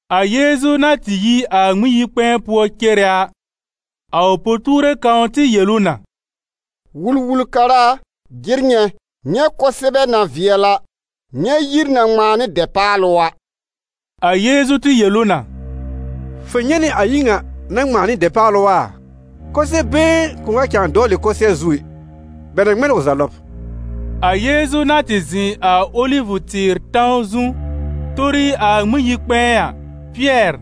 A Yeezu na tɩ yi a Ŋmɩn-yi-kpɛ̃ɛ pʋɔ cere a, a ʋ po-tuure kãw tɩ yel ʋ na: «Wul-wul-kara a, jɩr nyɛ̃! Nyɛ̃ kʋsɛbɛ na vɩɛl a! Nyɛ̃ yir na ŋmãa nɩ dɛpaalʋ a!» A Yeezu tɩ yel ʋ na: «Fʋ nyɛ̃ nɩ a yir ŋa na ŋmãa nɩ dɛpaalʋ a? Kʋsɛ-been kʋ̃ʋ wa cãa dɔwlɩ kʋsɩɛr zu ɛ, bɛ na ŋmɛ n ʋ za lɔb.» A Yeezu na tɩ zɩ̃ a Olivʋ-tɩɩr tãw zu tori a Ŋmɩn-yi-kpɛ̃ɛ a, Pɩɛr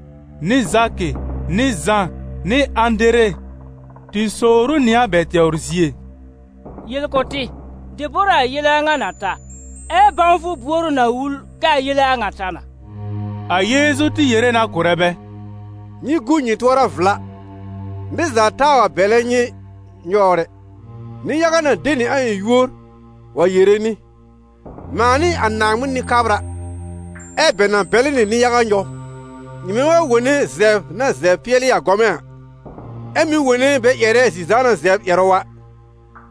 nɩ Zakɩ nɩ Zã nɩ Ãdere tɩ sowr ʋ nɩ a bɛ tɛwr zie: «Yel kʋ̀ tɩ, debor a a yele a ŋa na ta? Ɛ bãwfʋ buor ʋ na wul kɛ a yele a ŋa ta na?» A Yeezu tɩ yere na kʋ̀rɛ bɛ: «Nyɩ gu nyɩ tʋɔra vla, nɩr za taa wa bɛlɛ nyɩ nyɔwr ɛ. Nɩ-yaga na de nɩ a ɩ̃ yúor wa yere nɩ: ‹Mãa n'ɩ a Naaŋmɩn Nɩ-kabra.› Ɛ bɛ na bɛlɩ nɩ nɩ-yaga nyɔw. Nyɩmɛ wa wone zɛbr na zɛbr pɩɛlɩ a gɔmɛ̃ a, ɛ mɩ̀ wone bɛ ƴɛrɛ zi-zãana zɛbr ƴɛrʋ a,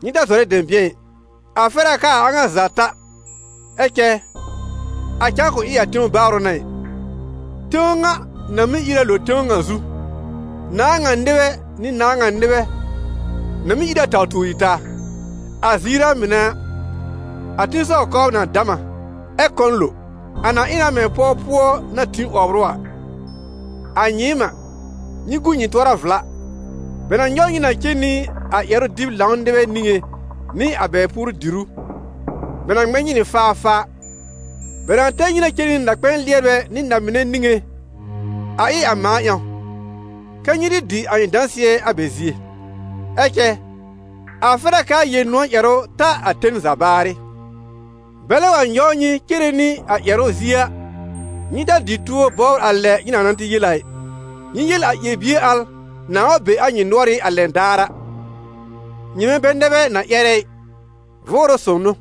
nyɩ ta zɔrɛ dɛ̃bɩ̃ɛ ɩ, a fɛr a kɛ a a ŋa za ta, ɛ cɛ a cãa kʋ̃ ɩ a tẽw baarʋ n'a ɩ. Tẽw ŋa na mɩ́ ìr a lo tẽw ŋa zu, nãà ŋa nɩbɛ nɩ nãà ŋa nɩbɛ na mɩ́ ìr a taw tuori taa. A ziir a mɩnɛ a, a tẽsɔw kɔbr na dam a, ɛ kɔ̃ lo. A na ɩ na mɛ̃ pɔw pʋɔ na tĩ 'wɔbr ʋ a. A nyɩɩm a, nyɩ gu nyɩ tʋɔra vla. Bɛ na nyɔw nyɩ na cen nɩ a ƴɛrʋ-dɩb-lãw nɩbɛ niŋé nɩ a bɛ puoru-dìrú, bɛ na ŋmɛ nyɩ nɩ faafaa, bɛ na tɛr nyɩ na cen nɩ na-kpɛ̃ɛ lɩɛrbɛ nɩ na-mɩnɛ niŋé, a ɩ a mãa ƴãw, kɛ́ nyɩ tɩ dɩ a ɩ̃ dãsɩɛ a bɛ zie. Ɛ cɛ a fɛr a kɛ a Yel-nʋ̃ɔ̀ ƴɛrʋ ta a ten za baarɩ. Bɛlɛ wa nyɔw nyɩ cere nɩ a ƴɛrʋ zie a, nyɩ ta dɩ tuo bɔbr a lɛ nyɩ na na yel a ɩ; nyɩ yel a ƴɛr-bie al nãa wa be a nyɩ nʋɔrɩ́ a lɛn daar a, nyɩmɛ bɛ nɛ bɛ na ƴɛrɛ ɩ, Vʋʋrʋ Sõw n'ʋ.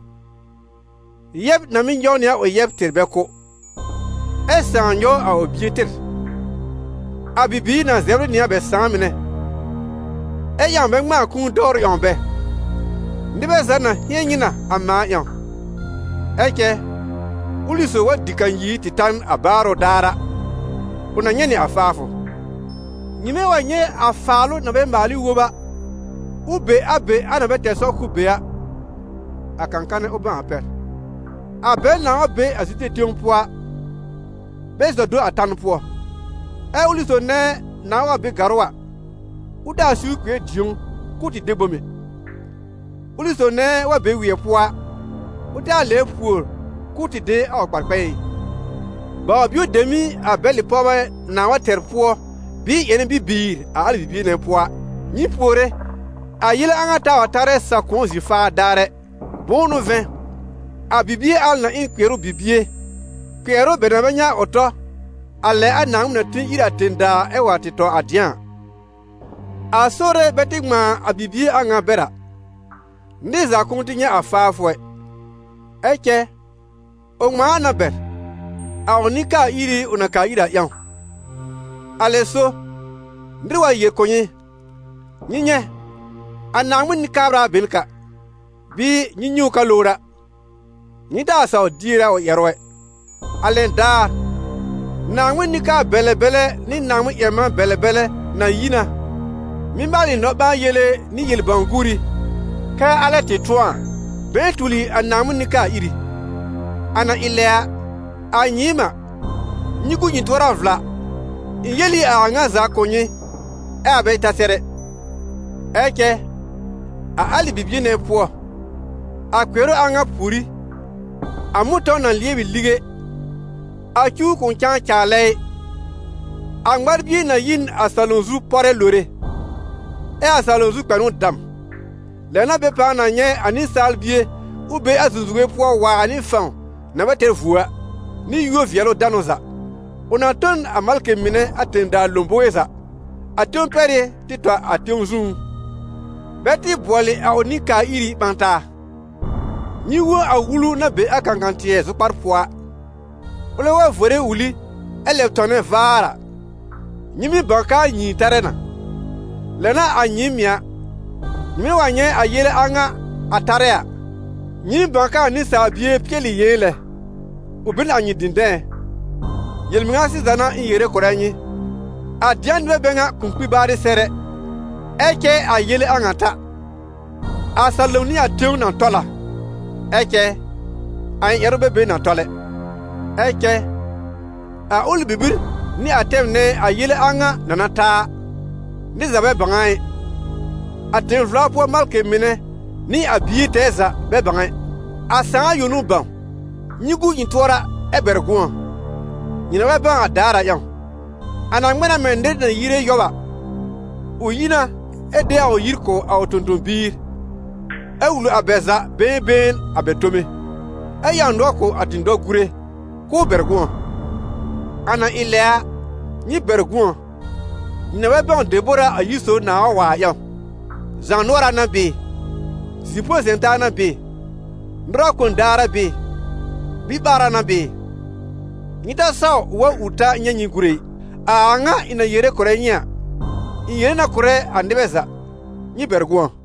Yɛb na mɩ́ nyɔw nɩ a ʋ yɛb tɩr bɛ kʋ́, ɛ sãà nyɔw a ʋ bie tɩr, a bibiir na zɛbr ɩ nɩ a bɛ sãà mɩnɛ, ɛ ƴãw bɛ ŋmãa kũu dɔwrʋ ƴãw bɛ. Nɩbɛ za na hɩ̃ɛn nyɩ na, a mãa ƴãw. Ɛ cɛ ʋlɩ sob wa dɩ kanyir tɩ ta n a baarʋ daar a, ʋ na nyɛ̃ nɩ a faafʋ. «Nyɩmɛ wa nyɛ̃ a Faalʋ-na-bɛ-maal-ɩ wob- a, ʋ be a be a na bɛ tɛr sɔr k'ʋʋ be a, (a kã-kanɛ, ʋ bãw a pɛr), a bɛl nãa wa be a Zude tẽw pʋɔ a, bɛ zɔ do a tan pʋɔ. Ɛ ʋlɩ sob nɛ nãa wa be gàrʋ́ a, ʋ taa siwr kpɩɛr dĩ̀ó k'ʋʋ de bom ɛ. Ʋlɩ sob nɛ wa be wɩɛ pʋɔ a, ʋ taa lɛbr pùor k'ʋʋ tɩ de a ʋ kpar-kpɛ̃ɛ ɩ. Baw-bio dem n'ɩ a bɛlɩ pɔwbɛ nãa wa tɛr pʋɔ, bɩɩ ƴɛnɛ bibiir a alɩ bibie nɛ pʋɔ a. Nyɩ puore a yele a ŋa taa wa tarɛ sa-kʋ̃ɔ zi-faa daar ɛ. Bʋ̃ʋ n'ʋ vɛ̃, a bibie al na ɩ n kpɩɛrʋ bibie, kpɩɛrʋ bɛ na bɛ nyɛ̃ a ʋ tɔ, a lɛ a Naaŋmɩn na tĩ ír a tẽ-daa ɛ wa tɩ tɔ a dɩ̃a a. A Sore bɛ tɩ ŋmãa a bibie a ŋa bɛr a, nɩr za kʋ̃ʋ nyɛ̃ a faafʋ ɛ; ɛ cɛ ʋ ŋmãa a na bɛr, a ʋ nɩ-kaa-iri ʋ na kaa ir a ƴãw. Alɛ so, nɩr wa yel kʋ̀ nyɩ: ‹Nyɩ nyɛ̃, a Naaŋmɩn Nɩ-kabra be n ka›, bɩɩ ‹Nyɩ nyɛ̃ ʋ ka lowr a›, nyɩ taa sawr dier a ʋ ƴɛrʋ ɛ. A lɛn daar, Naaŋmɩn nɩ-kabr-bɛlɛ-bɛlɛ nɩ Naaŋmɩn-ƴɛr-man-bɛlɛ-bɛlɛ na yi na, mɩ́ maalɩ nɔ-ɓãa-yele nɩ yel-bãw-guuri, kɛ alɛ tɩ tʋ̃ɔ a, bɛ̃ɛ tuli a Naaŋmɩn nɩ-kaa-iri. A na ɩ lɛ a, a nyɩɩm a, nyɩ gu nyɩ tʋɔra vla, ɩ̃ yel ɩ a a ŋa za kʋ̀ nyɩ ɛ a bɛ ta sɛr ɛ.» «Ɛ cɛ a alɩ bibie nɛ pʋɔ, a kpɩɛrʋ a ŋa pùorí, a mʋ̃tɔ̃w na lɩɛb ɩ lige, a cuw kʋ̃ cãa caalɛ ɩ, a ŋmar-bie na yi n a salom zu pɔrɛ lore, ɛ a salom zu kpɛnʋ dam. Lɛ n'a bɛ pãa na nyɛ̃ a Nɩsaal Bie ʋ be a zũzuwe pʋɔ waar nɩ fãw na bɛ tɛr vuo a, nɩ yúor-vɩɛlʋ-danʋ za. Ʋ na tõ n a malkɩ mɩnɛ a tẽ-daa lõbowe za, a tẽw pɛrɩ́ tɩ tɔ a tẽw zũú, bɛ tɩ bʋɔlɩ a ʋ nɩ-kaa-iri ɓã taa.» «Nyɩ wõ a wulu na be a kãkã-tɩɛ zʋkpar pʋɔ a. Ʋlɛ wa vore wuli ɛ lɛb tɔmnɛ vaar a, nyɩ mɩ́ bãw kɛ a nyĩi tarɛ na. Lɛ n'a a nyɩɩm mɩ̀ a, nyɩmɛ wa nyɛ̃ a yele a ŋa a tarɛ a, nyɩɩm bãw kɛ a Nɩsaal Bie pɩɛl ɩ yɩ̃ɛ lɛ, ʋ be n a nyɩ dɩ̃dɛ̃ɛ́. Yel-mɩŋa sɩza n'a ɩ̃ yere kʋ̀rɛ nyɩ, a dɩ̃a nɩbɛ bɛ ŋa kʋ̃ kpi baarɩ sɛr ɛ, ɛ cɛ a yele a ŋa ta. A salom nɩ a tẽw na tɔl a, ɛ cɛ a ɩ̃ ƴɛrʋ bɛ be na tɔl ɛ.» «Ɛ cɛ a ʋlɩ bibir nɩ a tɛm nɛ a yele a ŋa na na ta a, nɩr za bɛ bãw a ɩ, a tẽ-vla pʋɔ malkɩ mɩnɛ nɩ a Bie tɛɛ za bɛ bãw ɛ. A Sãà yõ n'ʋ bãw. Nyɩ gu nyɩ tʋɔra ɛ bɛr gʋ̃ɔ, nyɩ na bɛ bãw a daar a ƴãw. A na ŋmɛ na mɛ̃ nɩr na yire yɔb a: ʋ yi na ɛ de a yir kʋ̀ a ʋ tõ-tõ-biir, ɛ wul a bɛ za been been a bɛ tome, ɛ ƴãw nʋɔr kʋ̀ a dɩ̃dɔ-gùre k'ʋʋ bɛr gʋ̃ɔ. A na ɩ lɛ a, nyɩ bɛr gʋ̃ɔ, nyɩ na bɛ bãw debor a a yir sob nãa wa a ƴãw: zaanʋɔra n'a bɩɩ, zi-põ-zɛ̃-taa n'a bɩɩ, nʋrɩ kon daar a bɩɩ, biɓaara n'a bɩɩ. Nyɩ ta saw ʋ wa ur ta nyɛ̃ nyɩ gúre ɩ. A a ŋa ɩ̃ na yere kʋ̀rɛ nyɩ a, ɩ̃ yere na kʋ̀rɛ a nɩbɛ za: nyɩ bɛr gʋ̃ɔ!»